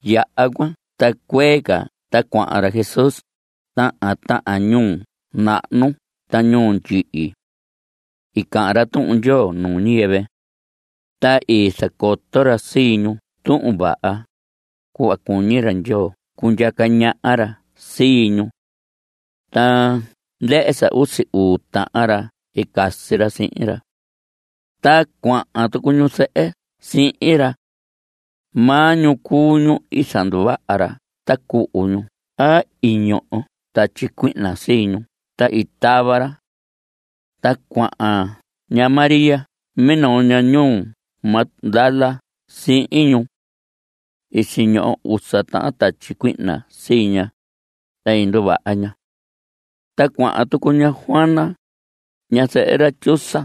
Yaha cuan ta cuee ca ta cuahan ra Jesús tahan tahan ñuu nahnu ta ñuu ndyihi. I cahan ra Tuhun Ndyoo nuu ñiyɨvɨ. Ta i zacoto ra sii ñu Tuhun Vaha, cuhva cuñi ra Ndyoo cundyaca ñaha ra sii ñu. Ta ndɨhɨ sa usi uu tahan ra i casi ra sihin ra. Ta cuahan tucu ñu zɨhɨ sihin ra. Maa ñu cuu ñu i zanduvaha ra ta cuhu ñu a i ñoho tatyi cuihna sii ñu ta i tava ra. Ta cuahan ña María minoo ñaha ñuu Magdala sihin ñu. I siñoho usa tahan tatyi cuihna sii ña, ta nduvaha ña. Ta cuahan tucu ña Juana, ñazɨhɨ ra Chuza.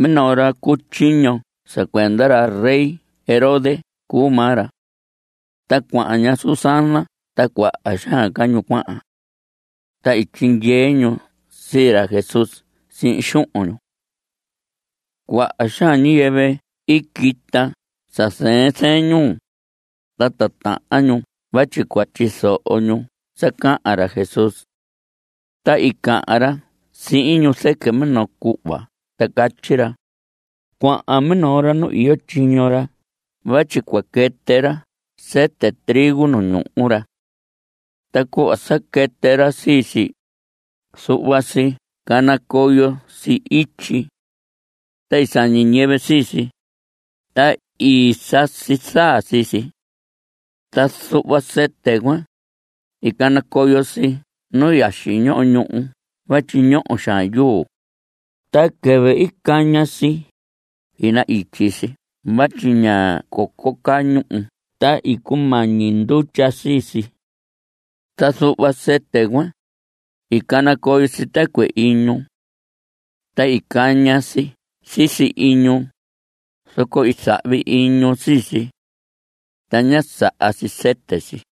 Minoo ra cu tyiño sa cuenda ra rey Herodes cuu maa ra. Ta cuahan ña Susana ta cuaha xaan ca ñu cuahan. Ta i tyindyee ñu sii ra Jesús sihin xuhun ñu. Cuaha xaan ñiyɨvɨ i quita sa zɨɨn zɨɨn ñuu, ta titahan ñu vatyi cua tyizoho ñu sa cahan ra Jesús. Ta i cahan ra sihin ñu zɨquɨ minoo cuhva ta catyi ra: Cuahan minoo ra nu iyo tyiño ra vatyi cua quɨtɨ ra sɨtɨ trigo nu ñuhu ra. Ta cuhva sa quɨtɨ ra sii si, zuhva si canacoyo si ityi. Ta i sañi ñiyɨvɨ sii si, ta i sasi zaa sii si. Ta zuhva sɨtɨ cuan, i canacoyo si nu yaxi ñoho ñuhu vatyi ñoho xaan yuu. Ta quɨvɨ i caña si, i na‑ityi si vatyi ña coco caa ñuhu ta i cumañi ndutya sii si. Ta zuhva sɨtɨ cuan, i canacoyo si tɨcuɨ iñu. Ta i caña si sisi iñu, zoco i zahvi iñu sii si. Ta ñá saha si sɨtɨ si.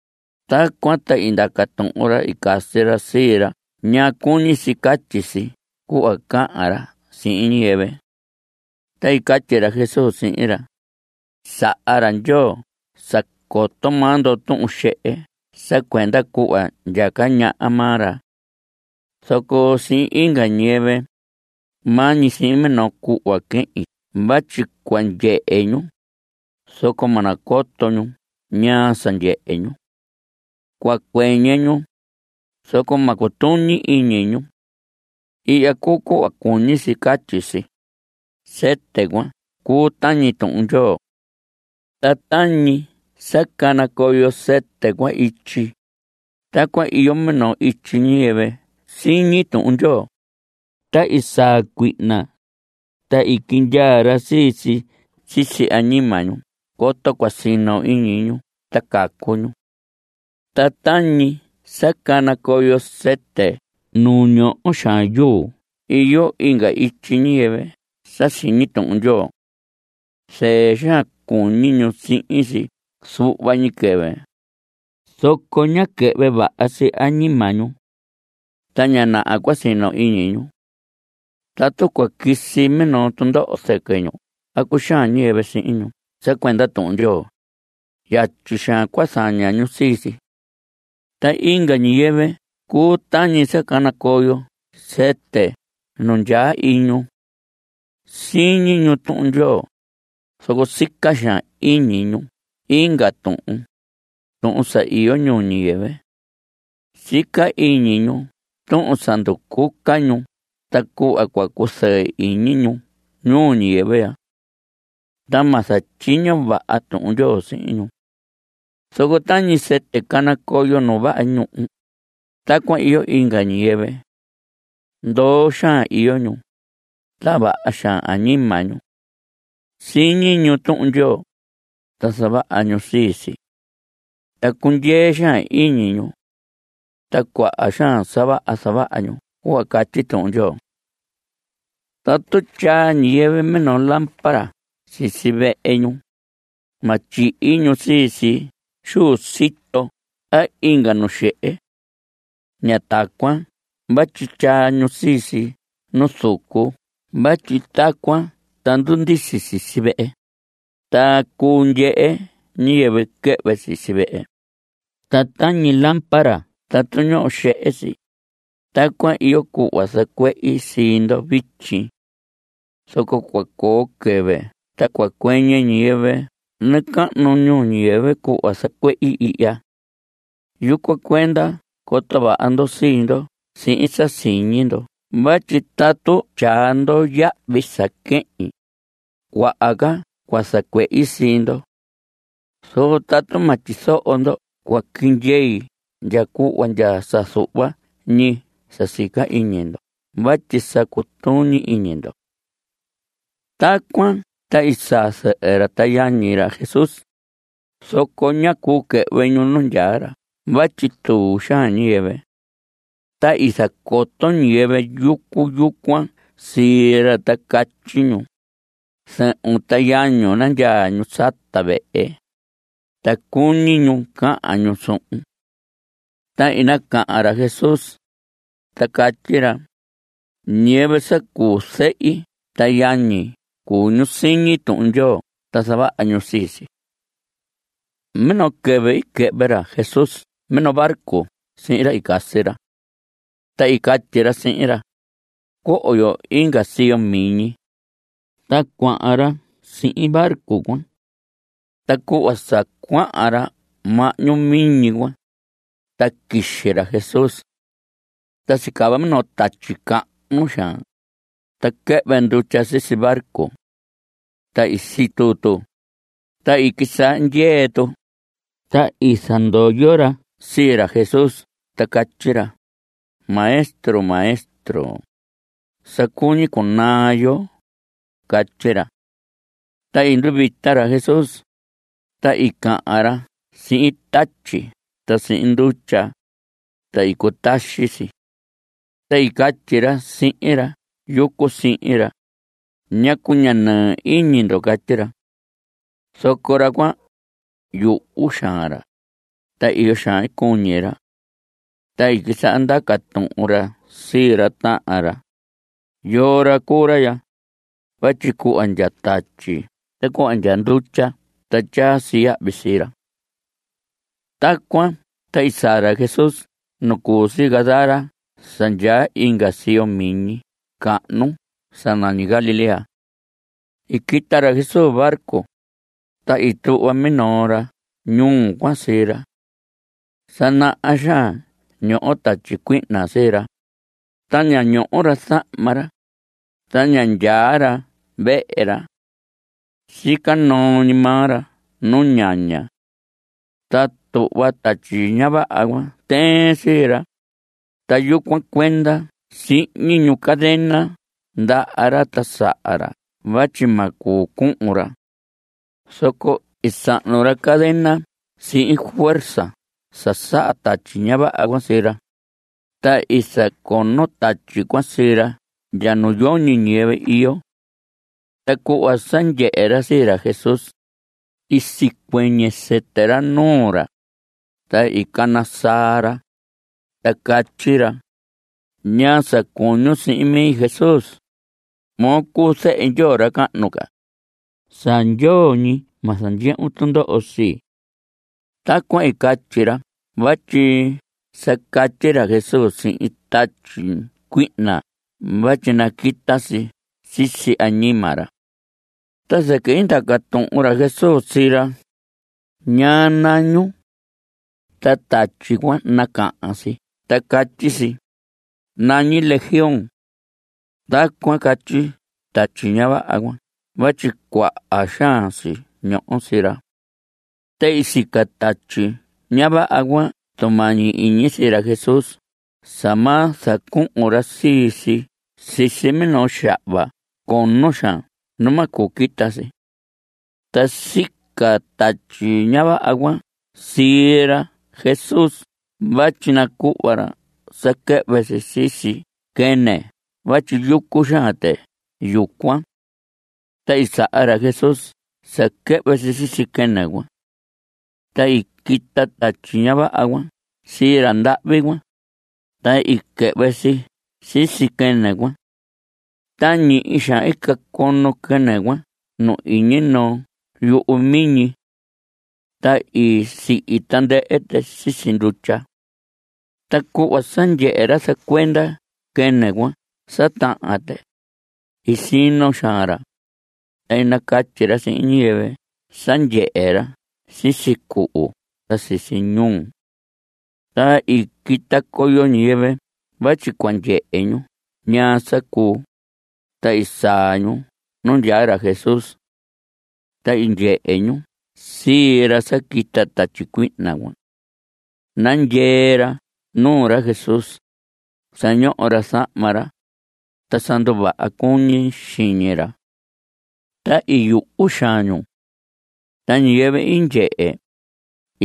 Tacuan ta i ndaca tuhun ra i casi ra sii ra ñaa cuñi si catyi si cuhva cahan ra sihin ñiyɨvɨ. Ta i catyi ra Jesús sihin ra: Saha ra Ndyoo sa coto maa ndo tuhun xehe sa cuenda cuhva ndyaca ñaha maa ra. Zoco sihin inga ñiyɨvɨ, maa ñi sihin minoo cuhva quehin vatyi cua ndyehe ñu, zoco ma nacoto ñu ñaa sa ndyehe ñu. Cua cuɨñɨ ñu, zoco ma cutuñi iñi ñu. Ihya cuu cuhva cuñi si catyi si: Sɨtɨ cuan cuu tañi Tuhun Ndyoo. Ta tañi sa canacoyo sɨtɨ cuan ityi, tacuan iyo minoo ityi ñiyɨvɨ siñi Tuhun Ndyoo. Ta saa cuihna, ta quindyaa ra sii si sisi añima ñu coto cua sino iñi ñu ta cacu ñu. Ta tañi sa canacoyo sɨtɨ nu ñoho xaan yuu iyo inga ityi ñiyɨvɨ sa siñi Tuhun Ndyoo. Zɨɨ xaan cuñi ñu sihin si zuhva ñi quɨvɨ, zoco ña quɨhvɨ vaha si añima ñu. Ta ña naha cua sino iñi ñu. Tatu cua quisi minoo tundoho zɨquɨ ñu a cuxaan ñiyɨvɨ sihin ñu sa cuenda Tuhun Ndyoo, yatyi xaan cua zaña ñu sii si. Ta inga ñiyɨvɨ cuu tañi sa canacoyo sɨtɨ nu ndyaa iñu. Siñi ñu Tuhun Ndyoo, zoco sica xaan iñi ñu inga tuhun, tuhun sa iyo ñuu ñiyɨvɨ. Sica iñi ñu tuhun sa nducuca ñu ta cuhva cua cuzɨɨ iñi ñu ñuu ñiyɨvɨ ya. Ta ma zatyiño vaha Tuhun Ndyoo sihin ñu. Zoco tañi sɨtɨ canacoyo nu vaha ñuhu, tacuan iyo inga ñiyɨvɨ. Ndoo xaan iyo ñu, ta vaha xaan añima ñu. Siñi ñu Tuhun Ndyoo, ta zavaha ñu sii si. Ta cundyee xaan iñi ñu. Ta cuaha xaan sa vaha zavaha ñu cuhva catyi Tuhun Ndyoo. Tatu tyaa ñiyɨvɨ minoo lámpara sisi vehe ñu, ma tyihi ñu sii si xu sito a inga nu xehe. Ña tacuan vatyi tyaa ñu sii si nu zucu vatyi tacuan ta ndundisi sisi vehe, ta cuu ndyehe ñiyɨvɨ quɨhvɨ sisi vehe. Ta tañi lámpara tatu ñoho xehe si, tacuan iyo cuhva zacuehi sii ndo vityi. Zoco cua coo quɨvɨ ta cua cuɨñɨ ñiyɨvɨ nacahnu ñuu ñiyɨvɨ cuhva zacuehi ihya. Yucuan cuenda coto vaha ndo sii ndo sihin sa siñi ndo vatyi tatu tyaa ndo yahvi sa quehin, cuaha ca cua zacuehi sii ndo. Zoco tatu ma tyizoho ndo cua quindyei ndya cuhva ndya sa zuhva ñi sa sica iñi ndo vatyi sa cutuñi iñi ndo. Tacuan ta i saa zɨhɨ ra ta yañi ra Jesús, zoco ñá cuu quɨhvɨ ñu nu ndyaa ra vatyi tuu xaan ñiyɨvɨ. Ta i zacoto ñiyɨvɨ yucu yucuan sii ra ta catyi ñu: Zɨhun ta yañun, nandyaa ñu sata vehe, ta cuñi ñu cahan ñu suhun. Ta i nacahan ra Jesús, ta catyi ra: Ñiyɨvɨ sa cuu zɨhi ta yañi cuu ñu siñi Tuhun Ndyoo ta zavaha ñu sii si. Minoo quɨvɨ i quɨhvɨ ra Jesús minoo barco sihin ra i casi ra. Ta i catyi ra sihin ra: Coho yo inga siyo miñi. Ta cuahan ra sihin barco cuan. Ta cuhva sa cuahan ra mahñu miñi cuan, ta quixi ra Jesús. Ta sicava minoo tatyi cahnu xaan. Ta quɨhvɨ ndutya sisi barco. Ta i situ tu, ta i quisaha ndyee tu. Ta i zandoyo ra sii ra Jesús ta catyi ra: ¡Maestro! ¡Maestro! ¡Sa cuñi cunaa yo! Catyi ra. Ta i nduvita ra Jesús, ta i cahan ra sihin tatyi ta sihin ndutya, ta i cutaxi si. Ta i catyi ra sihin ra yucu sihin ra: ¿Ñacu ña nɨɨ iñi ndo? Catyi ra. Zoco ra cuan, yuhu xaan ra, ta iyo xaan i cuñi ra. Ta i quisaha ndaca tuhun ra sii ra tahan ra: ¿Yoo ra cuu ra ya? vatyi cuhva ndya tatyi ta cuhva ndya ndutya ta tyaa si yahvi sii ra. Tacuan ta i saa ra Jesús nu cu si Gadara sa ndyaa inga siyo miñi cahnu sa nañi Galilea. I quita ra Jesús barco, ta i tuhva minoo ra ñuu cuan sii ra. Sa naha xaan ñoho tatyi cuihna sii ra, ta ña ñoho ra zahma ra, ta ña ndyaa ra vehe ra. Sica noo ñi maa ra nu ñaña. Ta tuhva tatyi ña vaha cuan tɨɨn sii ra, ta yucuan cuenda sihñi ñu cadena ndaha ra ta saha ra vatyi ma cuu cuhun ra. Zoco i sahnu ra cadena sihin fuerza sa saha tatyi ña vaha cuan sii ra, ta i zacono tatyi cuan sii ra ndya nu yoñi ñiyɨvɨ iyo. Ta cuhva sa ndyehe ra sii ra Jesús, i sicuɨñɨ sɨtɨ ra nuu ra, ta i cana saa ra, ta catyi ra: ¿Ñaa sa cuñun sihin mi, Jesús? Moo cuu zehe Ndyoo ra cahnu ca. Sa ndyoo ñi ma zandyehun tundoho sii. Tacuan i catyi ra vatyi sa catyi ra Jesús sihin tatyi cuihna vatyi naquita si sisi añima ra. Ta zɨquɨ i ndaca tuhun ra Jesús sii ra: ¿Ñaa nañun? Ta tatyi cuan nacahan si ta catyi si: Nañi Legión. Tacuan catyi tatyi ña vaha cuan vatyi cuaha xaan si ñoho sii ra. Ta i sica tatyi ña vaha cuan tumañi iñi sii ra Jesús sa ma zacuhun ra sii si sisi minoo xahva cono xaan nu ma cuu quita si. Ta sica tatyi ña vaha cuan sii ra Jesús vatyi nacuhva ra sa quɨhvɨ si sisi quɨnɨ vatyi yucu xaan tɨ yucuan. Ta i saha ra Jesús sa quɨhvɨ si sisi quɨnɨ cuan. Ta i quita tatyi ña vaha cuan sii ra ndahvi cuan, ta i quɨhvɨ si sisi quɨnɨ cuan. Ta ñihi xaan i cacono quɨnɨ cuan nu iñi noo yuhu miñi. Ta i sihi tandɨhɨ tɨ sisi ndutya. Ta cuhva sa ndyehe ra zacuenda quɨnɨ cuan sa tahan tɨ, i sino xaan ra, ta i nacatyi ra sihin ñiyɨvɨ sa ndyehe ra sisi cuhu ta sisi ñuu. Ta i quita coyo ñiyɨvɨ vatyi cua ndyehe ñu ñaa sa cuu, ta i saa ñu nu ndyaa ra Jesús. Ta i ndyehe ñu sii ra sa quita tatyi cuihna cuan. Nandyee ra nuu ra Jesús. Sa ñoho ra zahma ra, ta sa nduvaha cuñi xiñi ra. Ta i yuhu xaan ñu. Ta ñiyɨvɨ i ndyehe,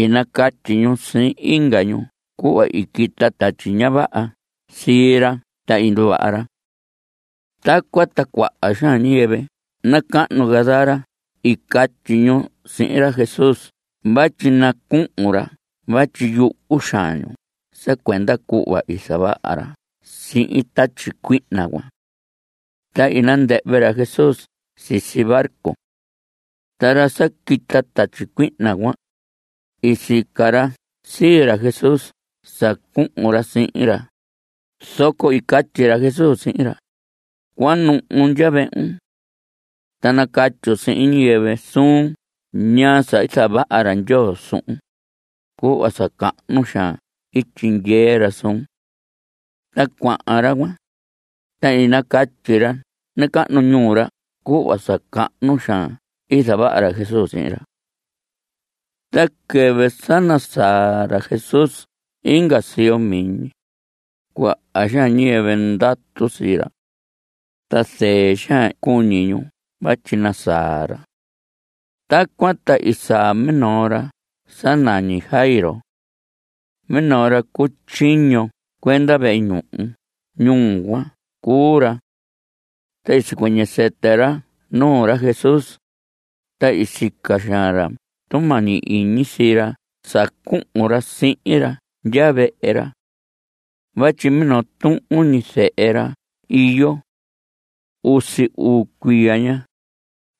i nacatyi ñu sihin inga ñu cuhva i quita tatyi ña vaha sii ra ta i nduvaha ra. Tacuan ta cuaha xaan ñiyɨvɨ nacahnu Gadara i catyi ñu sihin ra Jesús vatyi nacuhun ra vatyi i yuhu xaan ñu sa cuenda cuhva i zavaha ra sihin tatyi cuihna cuan. Ta i nandɨhvɨ ra Jesús sisi barco. Ta ra sa quita tatyi cuihna cuan, i sica ra sii ra Jesús sa cuhun ra sihin ra, zoco i catyi ra Jesús sihin ra: Cuanuhun ndya vehun. Ta nacatyun sihin ñiyɨvɨ suun ñaa sa i zavaha ra Ndyoo suhun, cuhva sa cahnu xaan i tyindyee ra suun. Ta cuahan ra cuan, ta i nacatyi ra nacahnu ñuu ra cuhva sa cahnu xaan i zavaha ra Jesús sihin ra. Ta quɨvɨ sa nasaa ra Jesús inga siyo miñi, cuaha xaan ñiyɨvɨ ndatu sii ra. Ta zɨɨ xaan cuñi ñu vatyi nasaa ra. Tacuan ta i saa minoo ra sa nañi Jairo. Minoo ra cu tyiño cuenda vehe ñuhu ñuu cuan cuu ra. Ta i sicuɨñɨ sɨtɨ ra nuu ra Jesús, ta i sica xaan ra tumañi iñi sii ra sa cuhun ra sihin ra ndya vehe ra. Vatyi minoo tuhun ñi zehe ra iyo. Usi uu cuiya ña,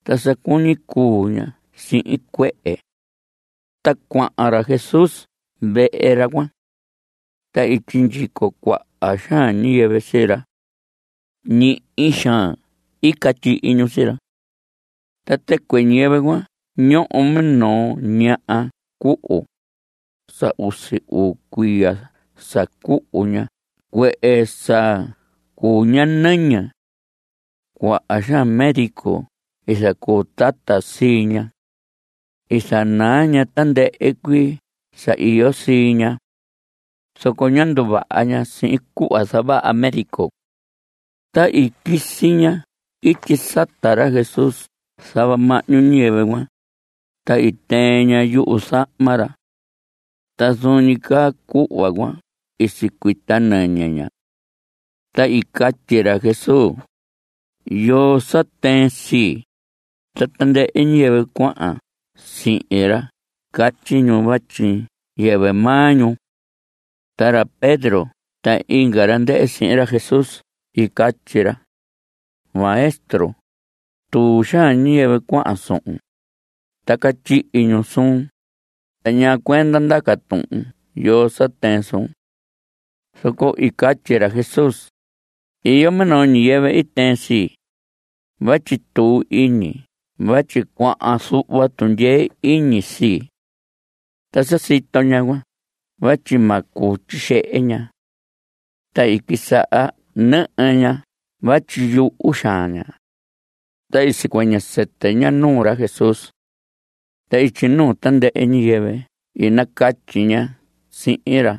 ta sa cuñi cuu ña sihin cuehe. Ta cuahan ra Jesús vehe ra cuan. Ta i sindyico cuaha xaan ñiyɨvɨ sii ra. Ñihi xaan i catyihi ñu sii ra. Ta tɨcuɨ ñiyɨvɨ cuan ñoho minoo ñaha cuhu. Sa usi uu cuiya sa cuhu ña cuehe sa cuu ña nɨñɨ. Cuaha xaan médico i zacuu tata sii ña. I zanaa ña tandɨhɨ cuii sa iyo sii ña. Zoco ñá nduvaha ña sihin cuhva zavaha médico. Ta i quisi ña ityi sata ra Jesús zava mahñu ñiyɨvɨ cuan, ta i tɨɨn ña yuzahma ra. Ta zuun ñi caa cuhva cuan i sicuita nɨñɨ ña. Ta i catyi ra Jesús: ¿Yoo sa tɨɨn sii? Ta tandɨhɨ ñiyɨvɨ cuahan sihin ra catyi ñu vatyi yɨvɨ maa ñu. Ta ra Pedro ta inga ra ndɨhɨ sihin ra Jesús i catyi ra: Maestro, tuu xaan ñiyɨvɨ cuahan suhun, ta catyihi ñu suun. ¿Ta ñaa cuenda ndaca tuhun yoo sa tɨɨn suun? Zoco i catyi ra Jesús: Iyo minoo ñiyɨvɨ i tɨɨn sii, vatyi tuu iñi vatyi cuahan zuhva tundyee iñi sii. Ta sa sito ñaha cuan vatyi ma cuu tyixehe ña, ta i quisaha nɨhɨ ña vatyi yuhu xaan ña. Ta i sicuɨñɨ sɨtɨ ña nuu ra Jesús. Ta ityi nuu tandɨhɨ ñiyɨvɨ i nacatyi ña sihin ra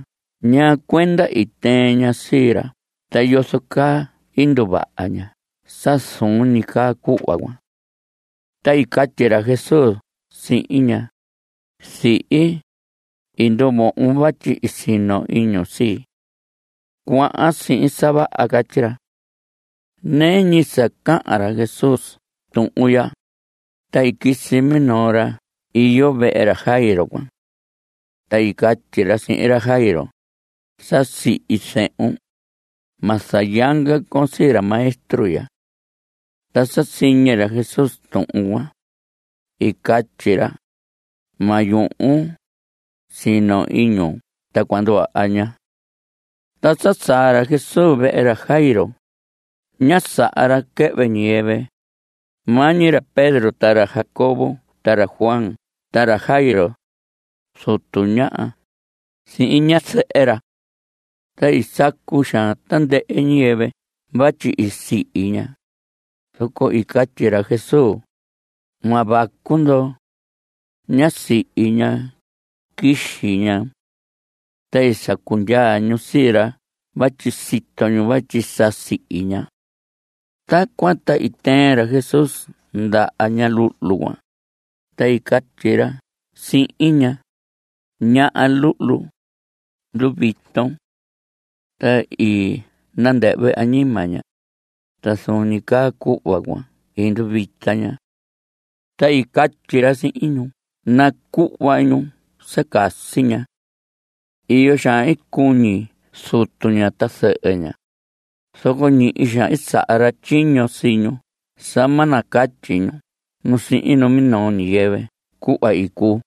ñaa cuenda i tɨɨn ña sii ra ta yozo caa i nduvaha ña sa zuun ñi caa cuhva cuan. Ta i catyi ra Jesús sihin ña: Zihi, i nduvohon vatyi i sino iñun sii. Cuahan sihin sa vaha. Catyi ra. Nɨɨ ñi sa cahan ra Jesús tuhun ya, ta i quisi minoo ra iyo vehe ra Jairo cuan. Ta i catyi ra sihin ra Jairo: Sa sihi zehun. Ma zayanga con sii ra maestro ya. Ta sa siñi ra Jesús tuhun cuan, i catyi ra: Ma yuhun. Sino iñun ta cua nduvaha ña. Ta sa saa ra Jesús vehe ra Jairo, ñá saha ra quɨhvɨ ñiyɨvɨ, maa ñi ra Pedro ta ra Jacobo ta ra Juan ta ra Jairo, zutu ña, sihin ñazɨhɨ ra. Ta i sacu xaan tandɨhɨ ñiyɨvɨ vatyi i sihi ña, zoco i catyi ra Jesús: Ma vacu ndo. Ñá sihi ña. Quixi ña. Ta i sacu ndyaa ñu sii ra vatyi sito ñu vatyi sa sihi ña. Tacuan ta i tɨɨn ra Jesús ndaha ña luhlu cuan, ta i catyi ra sihin ña: Ñaha luhlu, nduviton. Ta i nandɨhvɨ añima ña, ta zuun ñi caa cuhva cuan i nduvita ña. Ta i catyi ra sihin ñu nacuhva ñu sa casi ña. Iyo xaan i cuñi zutu ña ta zɨhɨ ña, zoco ñihi xaan i saha ra tyiño sii ñu sa ma nacatyi ñu nu sihin minoo ñiyɨvɨ cuhva i cuu.